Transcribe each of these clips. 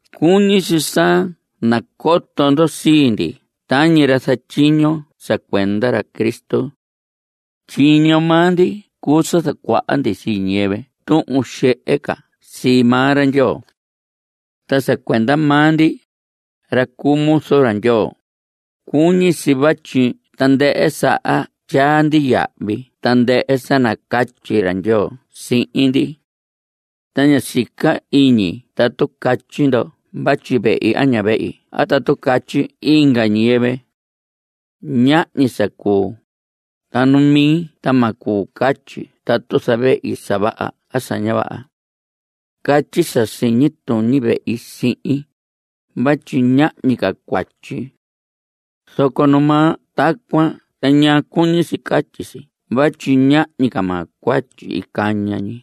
Cuñi si sa nacoto ndo sii ndi tañi ra zatyiño sa cuenda ra Cristo. Tyiño maa ndi cuu sa zacuaha ndi sii ñiyɨvɨ tuhun xehe ca sii maa ra Ndyoo. Ta sa cuenda maa ndi, ra cuu muzu ra Ndyoo, cuñi si vatyi tandɨhɨ saha tyaa ndi yahvi tandɨhɨ sa nacatyi ra Ndyoo sihin ndi. Ta ña sica iñi atu catyi ndo vatyi vehi a ña vehi a tatu catyi inga ñiyɨvɨ. Ñahñi sa cuu. Ta nu mi ta ma cuu catyi tatu zavehi sa vaha a sa ña vaha. Catyi sa siñi tuñi vehi sihin, vatyi ñahñi ca cuatyi. Zoco numaa tacuan ta ña cuñi si catyi si vatyi ñahñi maa cuatyi caña ñi.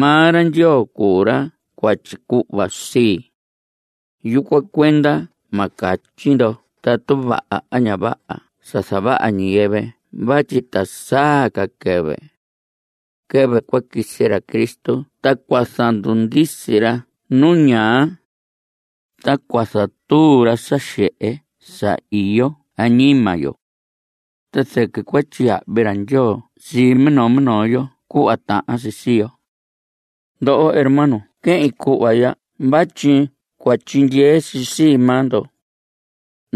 Maa ra Ndyoo cuu ra cua tyicuhva sii. Yucuan cuenda ma catyi ndo tatu vaha a ña vaha sa zavaha ñiyɨvɨ vatyi ta saa ca quɨvɨ. Quɨvɨ cua quisi ra Cristo ta cua zandundisi ra nu ñaa. Ta cua zatuu ra sa xehe sa iyo añima yo. Ta zɨquɨ cua tyiyahvi ra Ndyoo sii minoo minoo yo cuhva tahan si sii yo. Ndoho hermanos quehin cuhva ya vatyi cua tyindyee si sii maa ndo.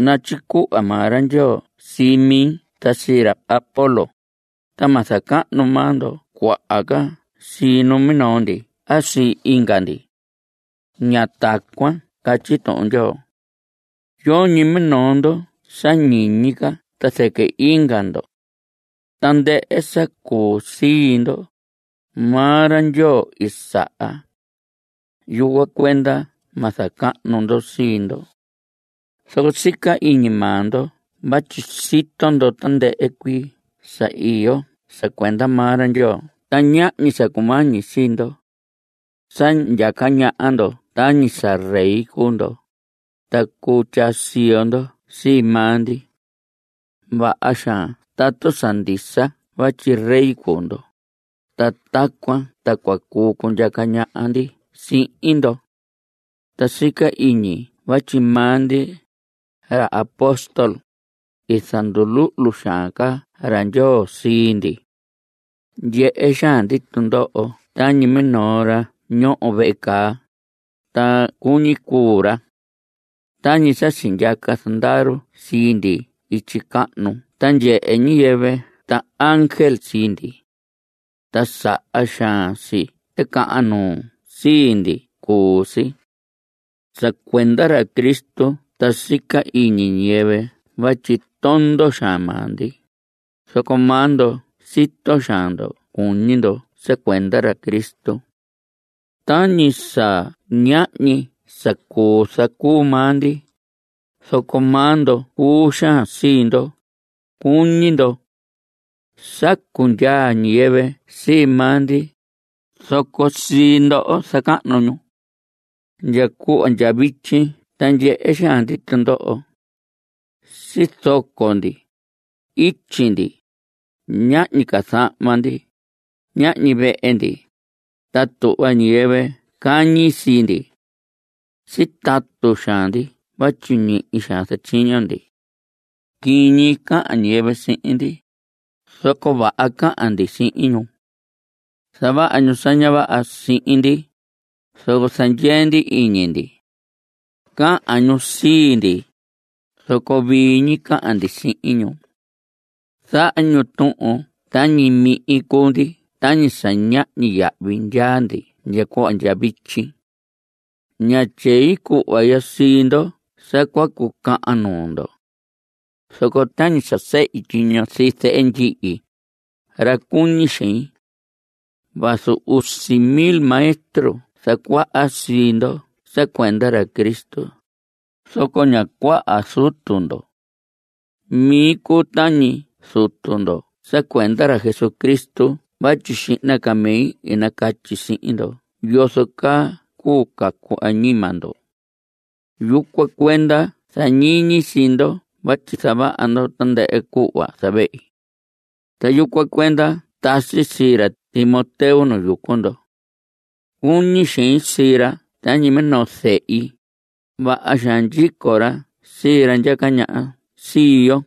Natyicuhva maa ra Ndyoo sii mi ta sii ra Apolos, ta ma zacahnu maa ndo cuaha ca sii minoo ndi a sii inga ndi. Ña tacuan catyi Tuhun Ndyoo. Yoñi minoo ndo sa ñiñi ca ta zɨquɨ inga ndo. Tandɨhɨ sa cuu sii ndo, maa ra Ndyoo i saha. Yucuan cuenda ma zacahnu ndo sii ndo. Zoco sica iñi maa ndo vatyi sito ndo tandɨhɨ cuii sa iyo sa cuenda maa ra Ndyoo ta ñahñi sa cumañi sii ndo. Sa ndyaca ñaha ndo tañi sa rey cuu ndo, ta cuu tyaa siyo ndo sii maa ndi. Vaha xaan tatu sa ndisa vatyi rey cuu ndo, ta tacuan ta cua cuu cundyaca ñaha ndi sihin ndo. Ta sica iñi vatyi maa ndi, ra apóstol, i zanduluhlu xaan ca ra Ndyoo sii ndi. Ndyehe xaan ndi tundoho tañi minoo ra sa ñoho vehe caa, ta cuñi cuu ra. Tañi sa sindyaca zandaru sii ndi ityi cahnu ta ndyehe ñiyɨvɨ ta ángel sii ndi. Ta saha xaan si ticahan nuu sii ndi cuu si. Sa cuenda ra Cristo ta sica iñi ñiyɨvɨ vatyi tondo xaan maa ndi, zoco maa ndo sito xaan ndo cuñi ndo sa cuenda ra Cristo. Tañi sa ñahñi sa cuu zacuu maa ndi, zoco maa ndo cuu xaan sii ndo, cuñi ndo. Sacu ndyaa ñiyɨvɨ sii maa ndi, zoco sii ndoho zacahnu ñu. Ndya cuhva ndya vityi ta ndyehe xaan ndi tundoho. Sizoco ndi. Ityi ndi. Ñahñi ca zahma ndi. Ñahñi vehe ndi. Ta tuhva ñiyɨvɨ cañi sii ndi. Sitatu xaan ndi vatyi ñihi xaan zatyiño ndi. Quiñi cahan ñiyɨvɨ sihin ndi, zoco vaha cahan ndi sihin ñu. Zavaha ñu sa ña vaha sihin ndi, zoco zandyee ndi iñi ndi. Cahan ñu sii ndi. Zoco vii ñi cahan ndi sihin ñu. Zaha ñu tuhun tañi mihin cuu ndi tañi sa ñahñi yahvi ndyaa ndi ndya cuhva ndya vityi. Ña tyei cuhva ya sii ndo sa cua cucahan nuu ndo. Zoco tañi sa sehi tyiño sii zehe ndyihi, ra cuñi xein. Vazu usi mil maestro zacuaha sii ndo sa cuenda ra Cristo, zoco ña cuaha zutu ndo. Mi cuu tañi zutu ndo sa cuenda ra Jesucristo vatyi xihna ca mi i nacatyi sihin ndo yozo caa cuu cacu añima ndo. Yucuan cuenda zañiñi sii ndo vatyi zavaha ndo tandɨhɨ cuhva zavehi. Ta yucuan cuenda tasi sii ra Timoteo nu yucu ndo. Cuñi xein sii ra tañi minoo zehi. Vaha xaan ndyico ra sii ra ndyaca ñaha sii yo.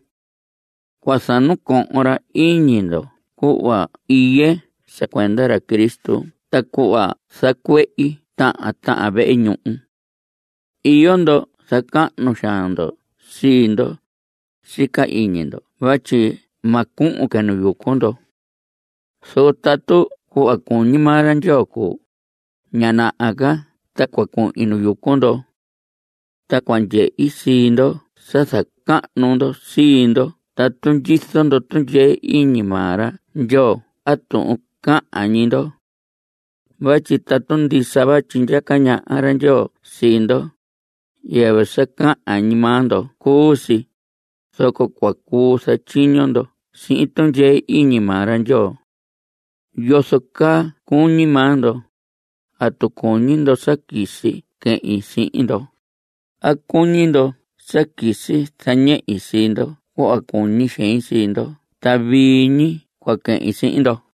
Cua zanacohon ra iñi ndo cuhva iye sa cuenda ra Cristo ta cuhva zacuehi tahan tahan vehe ñuhu. Iyo ndo zacahnu xaan ndo sii ndo. Sica iñi ndo vatyi ma cuhun que nu yucu ndo. Zoco tatu cuhva cuñi maa ra Ndyoo cuu, ña naha ca ta cua cuhin nu yucu ndo. Ta cua ndyehi sii ndoho sa zacahnu sii ndo tatu ndyizo ndo tundyee iñi maa ra Ndyoo a tuhun cahan ñi ndo. Vatyi tatu ndisa vatyi ndyaca ñaha ra Ndyoo sii ndo, yɨvɨ sa cahan ñi maa ndo cuu si, zoco cua cuu zatyiño ndo sihin tundyee iñi maa ra Ndyoo. ¿Yozo caa cuñi maa ndo? ¿Atu cuñi ndo sa quisi quehin sii ndo? ¿A cuñi ndo sa quisi zañehi sii ndo cuhva cuñi xein sii ndo ta vii ñi cua quehin sihin ndo?